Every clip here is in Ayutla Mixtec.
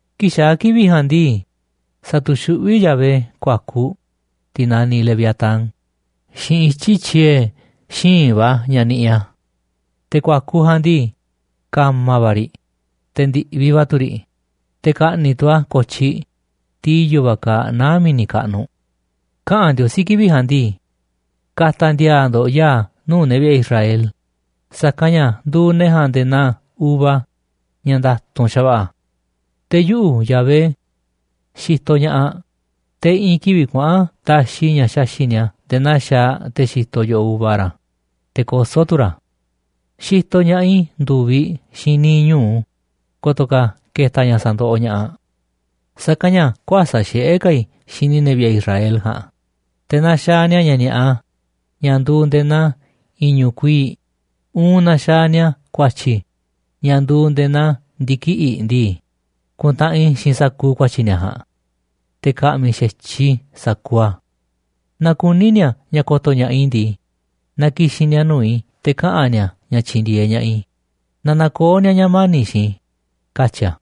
Kii̱ꞌ xaa̱ kivi̱ꞌ ja̱a̱nꞌ ndii, sa̱tu̱xuꞌví Yahvé ku̱a̱kuꞌ, tiꞌ naniꞌ leviatán, xiinꞌ ityi̱ tyiee̱ xíinꞌ va̱ ña̱ niꞌiꞌ a̱. Te̱ ku̱a̱kuꞌ ja̱a̱nꞌ ndii, ka̱ma̱ va̱ riꞌ, te̱ ndi̱ꞌviꞌ va̱ tu̱ riꞌ, te̱ ka̱ꞌni̱ꞌ tu̱ a̱ ko̱tyiꞌ, tiꞌ i̱yo̱ va̱ kaaꞌ naá mi̱ni̱ kaꞌnuꞌ. Kaꞌa̱n Ndiosí kivi̱ꞌ ja̱a̱nꞌ ndii: “Ka̱ta̱ ndi̱a̱a̱ ndo̱ꞌ ya̱a̱ nuu̱ꞌ ne̱ vi̱ꞌe̱ Israel, sa̱kanꞌ ña̱ nduuꞌ ne̱ ja̱a̱nꞌ nde̱e̱ naa uva ña̱ nda̱tu̱nꞌ xa̱va̱ꞌa̱. Te̱ yuꞌu̱, Yahvé, xitoꞌ ña̱ꞌaꞌ, te̱ i̱ꞌi̱n kivi̱ꞌ kuaꞌa̱n taxiꞌ i̱ ña̱ xaxi̱ꞌ ni̱a̱ nde̱e̱ naa xaaꞌ te̱ xitoꞌ yo̱ꞌoꞌ uva ra̱, te̱ kosó tu̱ ra̱ a̱. Xitoꞌ ña̱ꞌaꞌ i̱ ndu̱viꞌ xiinꞌ niiꞌ ñu̱u ko̱to̱ ka̱ ke̱ta̱ ña̱ sa̱ndoꞌoꞌ ña̱ꞌaꞌ. Sa̱kanꞌ ña̱ kuäsa̱ꞌ xiꞌé ka̱ i̱ xini ne̱ vi̱ꞌe̱ Israel ja̱a̱nꞌ, te̱ naaꞌ xaaꞌ ni̱a̱ ña̱ ni̱a̱ꞌa ña̱ nduuꞌ nde̱e̱ naa i̱ñu̱ꞌ kuii̱ꞌ, uun naaꞌ xaaꞌ ni̱a̱ ku̱a̱tyi̱ ña̱ nduuꞌ nde̱e̱ naa ndi̱kiꞌi̱ꞌ ndii, ku̱ntaꞌanꞌ i̱ xiinꞌ sa̱kuuꞌ ku̱a̱tyi̱ ni̱a̱ ja̱a̱nꞌ, te̱ ka̱ꞌmi̱ xa̱tyiꞌ i̱ sa̱kuuꞌ a̱. Naaꞌ kuní ni̱a̱ ña̱ ko̱to̱ ña̱ꞌaꞌ i̱ ndii, na ki̱xi̱n ni̱a̱ nuu̱ꞌ i̱ te̱ kaꞌa̱n ni̱a̱ ña̱ tyi̱ndi̱e̱eꞌ ña̱ꞌaꞌ i̱, na na̱koo̱ ni̱a̱ ña̱ mani̱ꞌ xiinꞌ i̱”, katyi̱ a̱.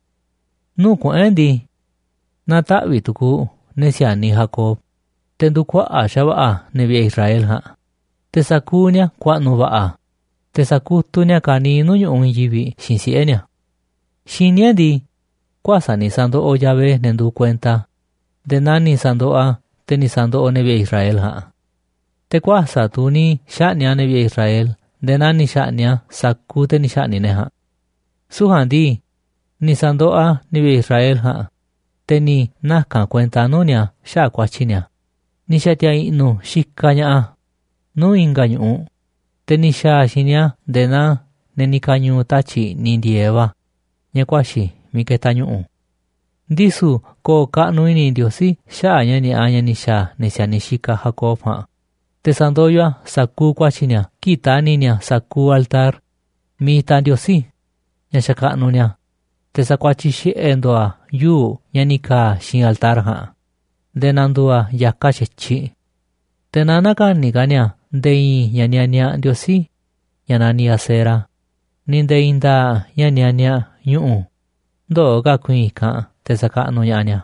Nuu̱ꞌ kuꞌu̱n e̱ꞌ ndii, na̱taꞌvi̱ꞌ tu̱ku̱u̱ ne̱ si̱a̱niꞌ Jacob, te̱ ndu̱kuaꞌa̱ꞌ xa̱va̱ꞌa̱ ne̱ vi̱ꞌe̱ Israel ja̱a̱nꞌ, te̱ sa̱kuuꞌ ni̱a̱ ku̱a̱ꞌnu̱ va̱ꞌa̱, te̱ sa̱kutuꞌ ni̱a̱ ka̱niiꞌ nuu̱ꞌ ñu̱ꞌuꞌ i̱i̱n yivi̱ꞌ xiinꞌ siꞌe̱ ni̱a̱. Xiní e̱ꞌ ndii, kuäsa̱ꞌ ni̱ sa̱ndoꞌoꞌ Yahvé ne̱ nduuꞌ kuenta a̱ nde̱e̱ naa ni̱ sa̱ndoꞌoꞌ a̱ te̱ ni̱ sa̱ndoꞌoꞌ ne̱ Israel ja̱a̱nꞌ. Te̱ kuäsa̱ꞌ tu̱ ni̱ xa̱ꞌni̱ꞌ a̱ ne̱ vi̱ꞌe̱ Israel nde̱e̱ naa ni̱ xa̱ꞌni̱ꞌ a̱ sa̱kuuꞌ te̱ ni̱ xa̱ꞌni̱ꞌ ne̱ ja̱a̱nꞌ. Süu̱ꞌ ja̱a̱nꞌ ndii, ni̱ sa̱ndoꞌoꞌ a̱ ne̱ vi̱ꞌe̱ Israel ja̱a̱nꞌ, te̱ ni̱ naka̱n a̱ kuenta nuu̱ꞌ ni̱a̱ xaꞌa̱ꞌ ku̱a̱tyi̱ ni̱a̱, ni̱ xa̱ti̱a̱ i̱ꞌnu̱ xikaꞌ ña̱ꞌaꞌ a̱ nuu̱ꞌ i̱nga̱ ñu̱ꞌuꞌ, te̱ ni̱ xa̱a̱ a̱ xiinꞌ ni̱a̱ nde̱e̱ naa ne̱ ni̱ ka̱ñu̱u̱ tatyi̱ꞌ i̱ꞌniꞌ ndi̱e̱eꞌ va̱ ña̱ kuaxi̱ miiꞌ ketaꞌ ñu̱ꞌu̱. Ndisu̱ ko̱o̱ kaꞌnuꞌ i̱ni̱ Ndiosí xaꞌa̱ꞌ ña̱ ni̱a̱ꞌa ña̱ ni̱ xa̱a̱ ne̱ si̱a̱niꞌ xikaꞌ Jacob ja̱a̱nꞌ, te̱ sa̱ndoyoꞌ a̱ sa̱kuuꞌ ku̱a̱tyi̱ ni̱a̱ kii̱ꞌ ta̱ni̱ ni̱a̱ sa̱kuuꞌ altar miiꞌ itaꞌ ndiosí, ña̱ xakaꞌnuꞌ ni̱a̱, te̱ sa̱kuatyiꞌ xiꞌe̱ ndo̱o̱ ni̱a̱ yuu̱ꞌ ña̱ ni̱ ka̱a̱ xiinꞌ altar ja̱a̱nꞌ nde̱e̱ na̱ndu̱u̱ a̱ ya̱kaꞌ xa̱tyiꞌ. Te̱ na nä̱ka̱ni̱ ka̱ ni̱a̱ nde̱e̱ i̱i̱n ña̱ nianiaꞌ ndiosí, ña̱ naniꞌ Asera, ni̱ nde̱e̱ i̱i̱n nda̱a̱ꞌ ña̱ nianiaꞌ ñu̱ꞌu̱ ndöo̱ ka̱ ku̱i̱i̱n i̱kanꞌ te̱ sa̱kaꞌnuꞌ ña̱ꞌaꞌ ni̱a̱.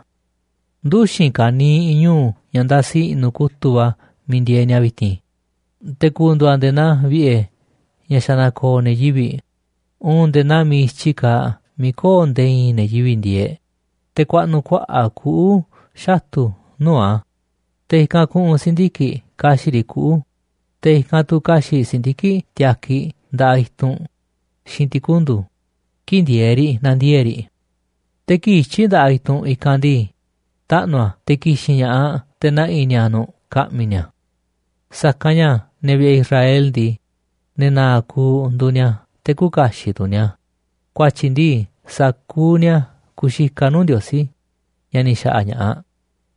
Nduxi̱n ka̱niiꞌ ñu̱u̱ ña̱ ndasi i̱ꞌnu̱ kutu̱ꞌ va̱ miiꞌ ndieeꞌ ni̱a̱ vi̱ti̱n, te̱ ku̱ndu̱u̱ a̱ nde̱e̱ naa vi̱ꞌe̱ ña̱ xa̱ na̱ko̱o̱ ne̱ yivi̱ꞌ, uun nde̱e̱ naa miiꞌ i̱tyi kaaꞌ miiꞌ köo̱ꞌ nde̱e̱ i̱i̱n ne̱ yivi̱ꞌ ndieeꞌ. Te̱ ku̱a̱ꞌnu̱ kuaꞌa̱ꞌ kuꞌu̱ xatu̱ nuu̱ꞌ a̱, te̱ i̱kanꞌ ku̱ꞌu̱n si̱ndiki̱ꞌ ka̱xi̱ꞌ riꞌ kuꞌu̱, te̱ i̱kanꞌ tu̱ ka̱xi̱ꞌ si̱ndiki̱ꞌ tiakiꞌ nda̱ꞌaꞌ i̱tunꞌ xiinꞌ ti̱kundu̱ kii̱ꞌ ndieeꞌ riꞌ nandiee̱ꞌ riꞌ. Te̱ kii̱ꞌ ityi̱ nda̱ꞌaꞌ i̱i̱n i̱tunꞌ i̱kanꞌ ndii, taꞌnu̱ a̱ te̱ ki̱xi̱n ña̱ꞌaꞌ te̱ na̱ꞌi̱ ni̱a̱ nu̱ꞌ ka̱ꞌmi̱ ni̱a̱. Sa̱kanꞌ ña̱ ne̱ vi̱ꞌe̱ Israel ndii, ne̱ na̱a̱ kuuꞌ nduuꞌ ni̱a̱ te̱ küuꞌ kaxiꞌ tu̱ ni̱a̱, ku̱a̱tyi̱ ndii, sa̱kuuꞌ ni̱a̱ ku̱u̱ xikaꞌ nuu̱ꞌ Ndiosí, ña̱ ni̱ xaꞌa̱ꞌ ña̱ꞌaꞌ,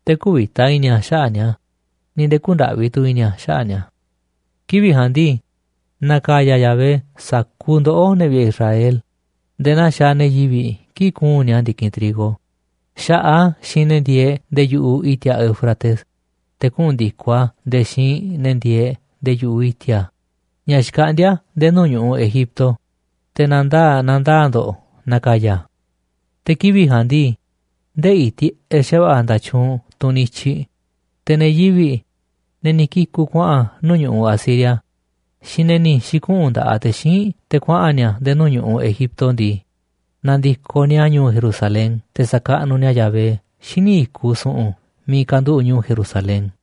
te̱ kü̱vi̱ta i̱ni̱ a̱ xaꞌa̱ꞌ ni̱a̱ ni̱ nde̱e̱ kü̱ndaꞌvi tu̱ i̱ni̱ a̱ xaꞌa̱ꞌ ni̱a̱. Kivi̱ꞌ ja̱a̱nꞌ ndii, na̱ka̱ya̱ Yahvé sa̱kuuꞌ ndoꞌó, ne̱ vi̱ꞌe̱ Israel, nde̱e̱ naa xaaꞌ ne̱ yivi̱ꞌ kii̱ꞌ kuu̱nꞌ ni̱a̱ ndi̱kinꞌ trigo. Xa̱ꞌaꞌ a̱ xiinꞌ ne̱ ndieeꞌ nde̱e̱ yu̱ꞌuꞌ i̱ti̱a̱ Éufrates, te̱ kuꞌu̱n ndi̱koꞌ a̱ nde̱e̱ xiinꞌ ne̱ ndieeꞌ nde̱e̱ yu̱ꞌuꞌ i̱ti̱a̱ ña̱ xkaꞌndíá nde̱e̱ nuu̱ꞌ ñu̱ꞌuꞌ Egipto, te̱ na̱ndaa̱ꞌ na̱ndaa̱ꞌ ndo̱ꞌ na̱ka̱ya̱ a̱. Te̱ kivi̱ꞌ ja̱a̱nꞌ ndii, ndeꞌi̱ tiꞌeꞌ xa̱va̱ꞌa̱ nda̱tyuunꞌ tunꞌ niꞌiꞌ i̱tyiꞌ, te̱ ne̱ yivi̱ꞌ, ne̱ ni̱ kiku̱ kuaꞌa̱n nuu̱ꞌ ñu̱ꞌuꞌ Asiria xiinꞌ ne̱ ni̱ xi̱kuꞌu̱n nda̱ꞌaꞌ te̱ xíinꞌ te̱ kuaꞌa̱n ni̱a̱ nde̱e̱ nuu̱ꞌ ñu̱ꞌuꞌ Egipto ndii, na̱ndi̱koꞌ ni̱a̱ ñu̱u̱ Jerusalén te̱ sa̱kaꞌnuꞌ ni̱a̱ Yahvé xíniꞌ i̱kuꞌ su̱ꞌu̱n miiꞌ kanduꞌu̱ꞌ ñu̱u̱ Jerusalén.